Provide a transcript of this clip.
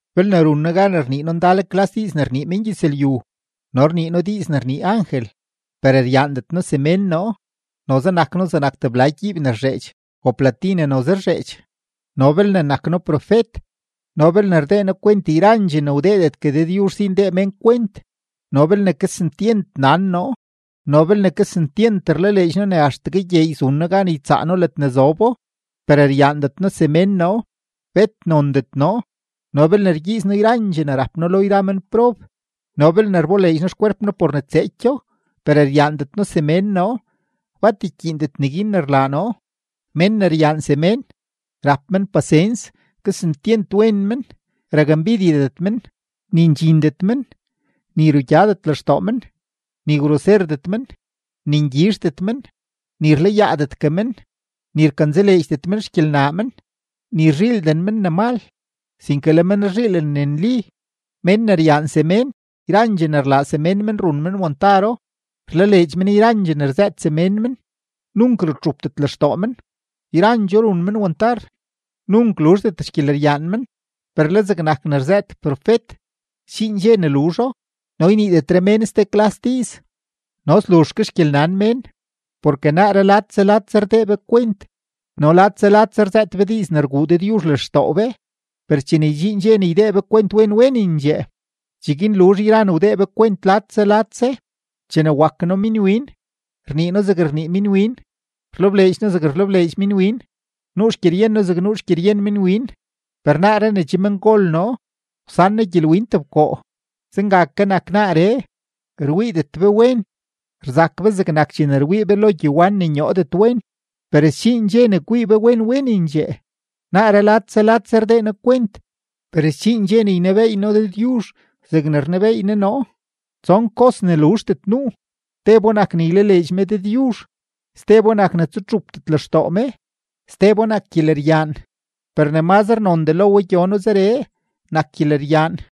Belne run noo gan ne rnii noo ndal klas diiz ne rnii mengyëzlyu no rnii noo diiz ne rnii angel, per ryaandet noo semén noo, noze nak noo zegnak tebla gyiib ne rzheedx o plati ne noze rzheedx. No belne nak noo profet no belne rdee noo kwent yrandxee ne wdeedetgue Dëdyuzh si ndee mén kwent no belne kesentyent nan noo no belne kesentyent rlaleedx noo ne axtegue gyeey zun noo gan ytsaa noo ledne zobo, per ryaandet noo semén noo, bet nondet noo. No belne rgyiiz noo yrandxee ne rap noo lo yra menprob no belne rboleedx noo xkwerp noo por ne tseekyo, per ryaandet noo semén noo, bat ykyiindet neguin ne rlaa noo. Mén ne ryaan semén, rap men pasens, kesentyent wen men, rakmbidyedet men, ni ndxindet men, ni rugyadet lextoo men, ni groserdet men, ni ngyizhdet men, ni rlayaadetgue men, ni rkanzaleedxdet men xgyelnaa men, ni rzhiilden men ne mal, sinke le men rzhiilen ne nli. Mén ne ryaan semén, yrandxee ne rlaa semén men run men wantaro, rlaleedx men yrandxee ne rzëët semén men, nunk rutxupdet lextoo men, yrandxoo run men wantar. Nunk luzhdet gyeleryaan. Per le zegnak ne rzëët profet, sdxiin dxe ne luzho, no yniidetre mén ste klas diiz, no sluzh ke xgyelnan mén. Porke naaree ladse ladse rdee be kwent no ladse ladse rzëët be diiz ne rguu Dëdyuzh lextoo be; per chene ydxiin dxe ne ydee be kwent wen wenendxee, cheguin luzh yra ne wdee be kwent ladse ladse. Chene wak noo minwin, rnii noo zeg rnii minwin, rlebleedx noo zeg rlebleedx minwin, nuu xgyeryen noo zeg nuu xgyeryen minwin; per naaree ne che mengol noo, wsan noo gyelwin tebkoo. Zenga ke nak naaree, rwiidet be wen, rzak be zegnak chene rwii be lo gyewan ne nyoodet wen; per sdxiin dxe ne kwii be wen wenendxee. Naaree ladse ladse rdee noo kwent, per sdxiin dxe ne ynebeey noo Dëdyuzh zegne rnebeey Ne noo. Tson kos ne luzhdet nuu; tebo nak ne ylaleedx me Dëdyuzh, stebo nak ne tsutxupdet lextoo me, stebo nak gyeleryaan; per ne mazre nondee lo we gyono zeree, nak gyeleryaan.